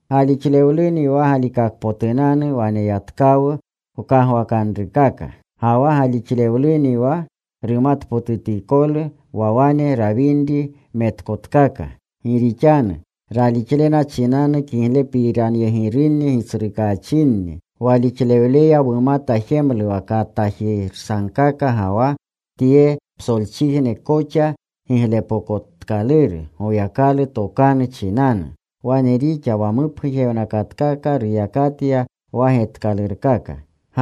Galixlewluni wa galikakpotunanu waneyatkawu wkagwakanrukaka. Ga wa galixlewluni wa rumatpotutikolu wa wane rawinri metkotkaka. Gi rixanu ralixlena chinanu kiglepiranyegirunni gitsrukaachinni. Walixlewleya wumata jemlu wa katagirsagkaka ga wa tye psolchijne koxa giglepokotkaluru Goyakalu tokanu chinanu. Wane rixa wa mupgujewnakatkaka ruyakatya wa getkalurkaka.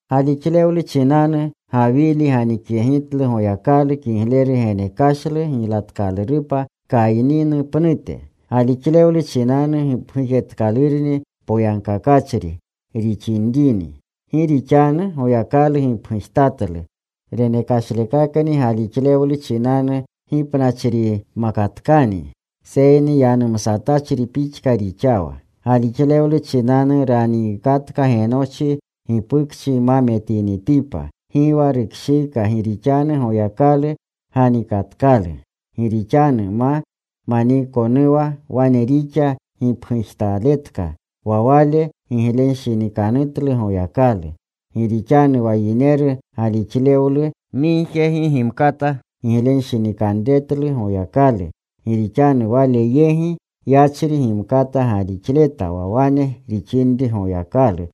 Galixlewlu chinanu Gawili ganikyegitlu Goyakalu kigleru genekashlu giylatkalurupa Kayninu pnute. Galixlewlu chinanu gipgujtatkalurni poyagkakachri rixinrini. Gi rixanu Goyakalu gipgujtatlu renekashlekakni. Galixlewlu chinanu gipnachrinimkatkani seyni yanumsatachri pixka rixawa. Galixlewlu chinanu raniikatka Genochi gipukchi ma metinitipa. Gi wa rukshiika gi rixanu Goyakalu ganikatkalu. Gi rixanu ma maniikonuwa wane rixa gipgujtaletka wa wale giglenshinikanutlu Goyakalu. Gi rixanu wa yineru galixlewlu migje gi gimkata giglenshinikanretlu Goyakalu. Gi rixanu Wale yegi yachri gimkata galixleta wa wane rixinri Goyakalu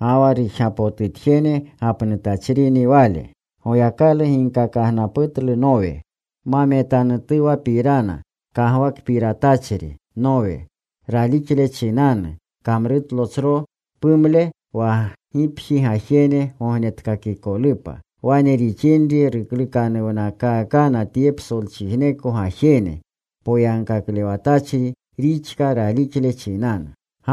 ga wa rujgapotutjene gapnutachrini Wale. Goyakalu ginkakagnaputlu Nowe ma metanutuwapirana. Kagwakpiratachri Nowe, ralixle chinanu kamrutlo tsro pumle wa gipji gajene gognetkakikolupa. Wane rixinri ruklukanuwnakakna tye psolchijneko gajene. Poyagkaklewatachri rixka ralixlewle chinanu.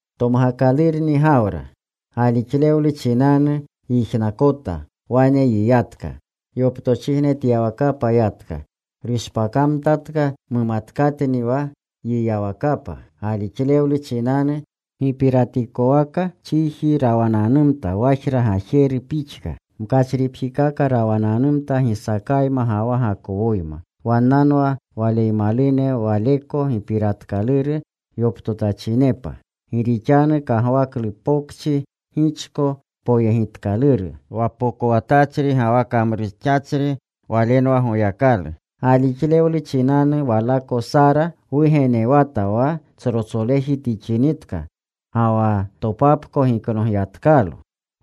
Tomgakalurni Gawra, galixlewlu chinanu yijnakota. Wane yiyatka. Yoptochijnetyawakapa yatka. Rushpakamtatka mumatkatni wa yiyawakapa. Galixlewlu chinanu gipiratikowaka chiji rawananumta wajra gajeru pixka. Mkachripjikaka rawananumta Gisaakayma ga wa Gakowoyma. Wannanwa waleymalune waleko gipiratkaluru yoptotachinepa. Gi rixanu kagwaklu pokchi gichko poyegitkaluru. Wa pokowatachri ga wa kamrujixachri walenwa Goyakalu. Galixlewlu chinanu walako Sara wugenewata wa tsrotsoleji tixinitka ga wa topapko giknogyatkalo.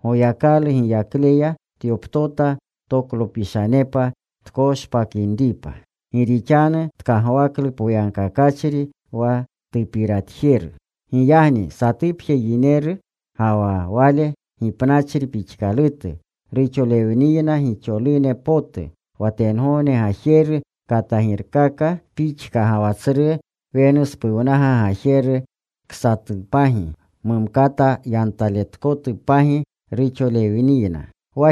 Goyakalu giyakleya tyoptota toklopishanepa tkoshpakinripa, gi rixanu tkagwaklu poyankakachri wa tupiryegitjeru. Giyagni satupje yineru, ga wa wale gipnachri pixkalutu, ruxolewniyna gixolune potu. Wa tengogne gajeru katagirkaka pixka, ga wa tsru wenuspuwnaga gajeru ksatupagi, mumkata yantaletkotupagi, ruxolewniyna.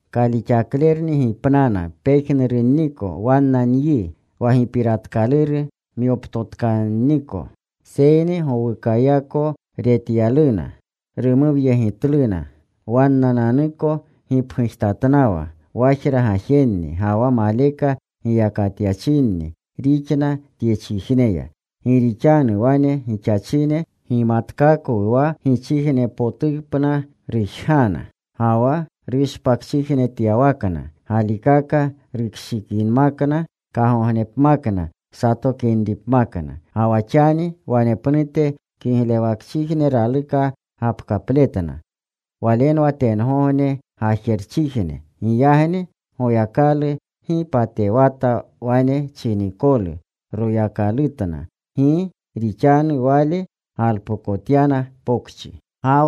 Kalixaklerunni gipnana pejnurunniko wanna nyi, wa gipiratkaluru myoptotkanniko. Seyni gowukayako retyaluna. Rumuwyegitluna. Wannananuko gipgujtatnawa wajra gajenni ga wa maleka giyakatyachinni rixna tyechijneya. Gi rixanu wane gixachine gimatkakwu wa gichijnepotupna rujgana. Ga wa rushpakchijnetyawakna galikaka rushinikinmakna, kagognepmakna satokinripmakna. Ga wa xani wanepnute kiglewakchijne raluka gapkapletna. Walenwa tengogne gajerchijne. Giyagni Goyakalu gi patewata wane chinikolu Royakalutna. Gi rixanu Wale galpokotyana pokchi.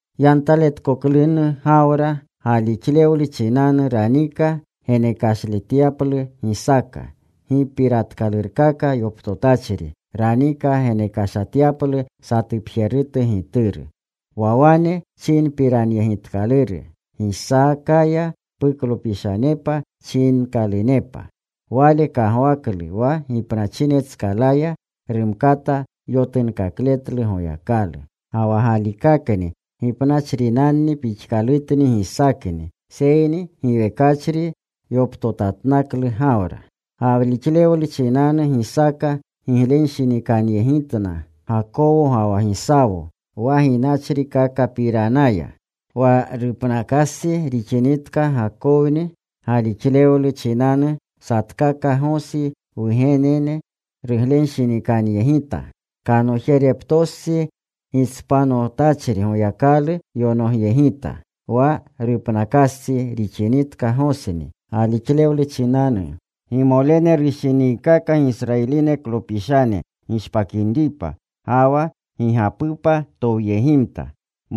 Yantaletkoklunu Gawra, galixlewlu chinanu ranika genekleshatyaplu Gisaaka. Gipiratkalurkaka yoptotachri ranika genekleshatyaplu satupjerutu gituru. Wa wane chinpiranyegitkaluru, Gisaakaya puklopishanepa chinkalunepa. Wale kagwaklu wa gipnachinetskalaya rumkata yotunkakletlu Goyakalu. Ga wa galikakni gipnachrinanni pixkalutni Gisaakni. Seyni giwekachri yoptotatnaklu Gawra. Galixlewlu chinanu Gisaaka giglenshinikanyegitna Gakowo ga wa Gisawo wa ginachrikakapapiranaya. Wa rupnakastsi rixinitka Gakowni, galixlewlu chinanu satkaka Gosi wgenene ruglenshinikanyegita. Kanojereptostsi gitspanotachri Goyakalu yonogyegita. Wa rupnakastsi rixinitka Gosni, galixlewlu chinanu gimolene rushiniikaka Gisrayiliklopishane gishpakinripa. Ga wa gigapupa towyegimta.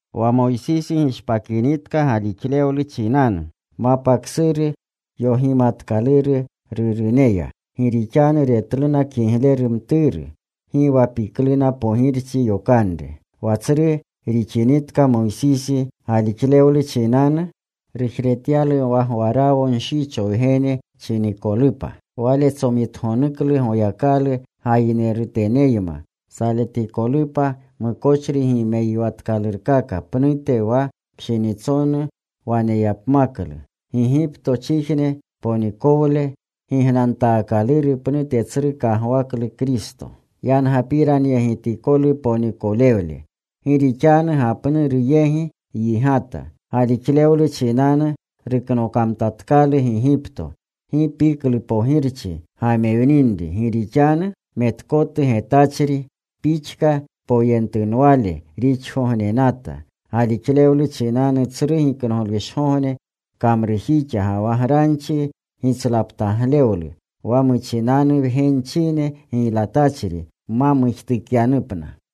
Wa Moysisi gishpakinitka, galixlewlu chinanu mapa ksuru yogimatkaluru ruruneya. Gi rixanu retluna kigleru mturu. Gi wa pikluna pogirchi yokanre. Wa tsru rixinitka Moysisi, galixlewlu chinanu rujretyalu wa Gwarawo nshicho wgene chinikolupa. Wale tsomitgonuklu Goyakalu gayineruteneyma saletikolupa, mukochri gimeyiwatkalurkaka pnute wa pshinitsonu waneyapmaklu. Gigiptochijne ponikolewle gignantaakaluru pnute tsru kagwaklu Kristo yangapiranyegitikolu ponikolewle. Gi rixanu gapnuru yegi yigata. Galixlewlu chinanu ruknokamtatkalu Gigipto. Gi piklu pogirchi gamewninri. Gi rixanu metkotu getachri pixka poyentunwale rixgognenata. Galixlewlu chinanu Tsru Giknoglushgogne kamrujixa ga wa granchi gitslaptaglewlu, wa muchinanu wgenchine giylatachri ma mujtukyapna.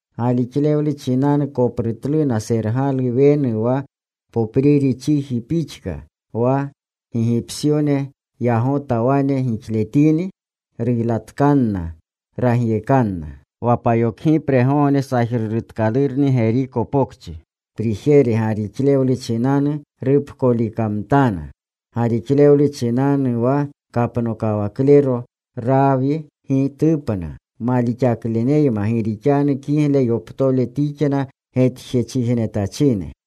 Galixlewlu chinanu koprutluna Sergalu Wenu wa popriri chiji pixka. Wa Gigipsyone yagota wane gixletini, ruylatkanna. Ragyekanna. Wa payokgipregogne sajrurutkalurni Geriko Pokchi prijere galixlewlu chinanu rupkolikamtana. Galixlewlu chinanu wa kapnokawaklero Raawi gi tupna malixakleneyma gi rixanu kigle yoptole tixna getjechijnetachine.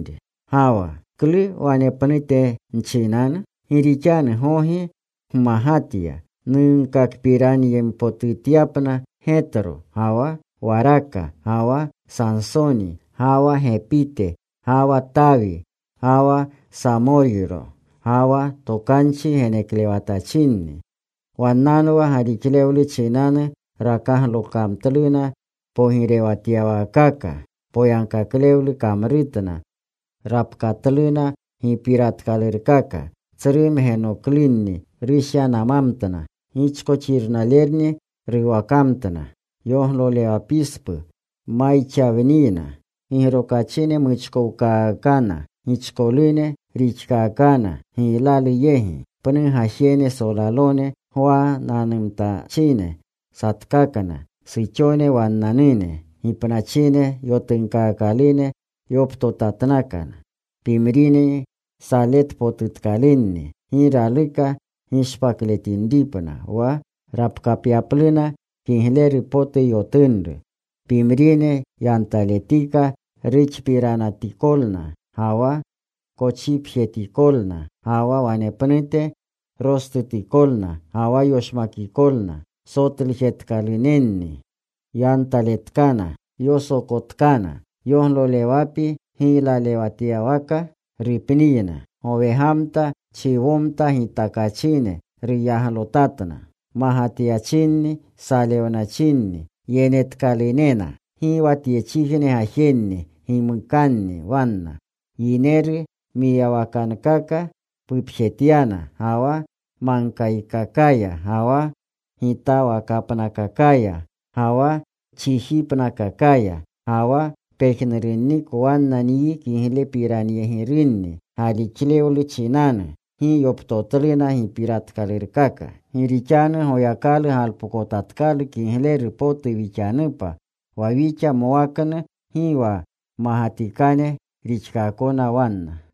Ga wa ¿klu wanepnute nchinanu? Gi rixanu gogi nmagatya nunkakpiranyempotutyapna Getyo, ga wa Waraka, ga wa Sansoni, ga wa Gepite, ga wa Tawi, ga wa Samoyro, ga wa tokanchi geneklewatachinni. Wannanwa galixlewlu chinanu rakaglokamtluna pogirewatyawaakaka, poyagkaklewlu kamrutna, rapkatluna gipiratkalurkaka, tsru mgenoklunni rushyanamamtna. Gichkoxirnalerni ruwakamtna. Yoglolewapispu mayxawniyna. Gigrokachine muchkowkaakana. Gichkolune rixkaakana giylalu yegi. Pnu gajene solalone gwanananumtachine satkakna. Suxone wannanune gipnachine yotunkaakalune yoptotatnakna. Pimrinni saletpotutkalunni. Gi raluka gishpakletinripna, wa rapkapyapluna kigleru potu yotunru. Pimrine yantaletika ruxpiranatikolna ga wa kochipjetikolna, ga wa wanepnute rostutikolna ga wa yoshmakikolna. Sotlujetkalunenni. Yantaletkana. Yosokotkana. Yoglolewapi giylalewatyawaka rupniyna. Gowegamta, chiwomta gitakachine ruyaglotatna. Magatyachinni. Salewnachinni. Yenetkalunena. Gi wa tyechijne gajenni gimukanni wanna. Yineru mwiyawakankaka pupjetyana, ga wa magkakakaya, ga wa gitawakapnakakaya ga wa chijipnakakaya. Ga wa pejnurunniko wanna nyi kiglepiranyegirunni galixlewlu chinanu. Gi yoptotluna gipiratkalurkaka. Gi rixanu Goyakalu galpokotatkalu kigleru potu wixanupa, wa wixa mwaknu gi wa mmagatikane rixkaakona wanna.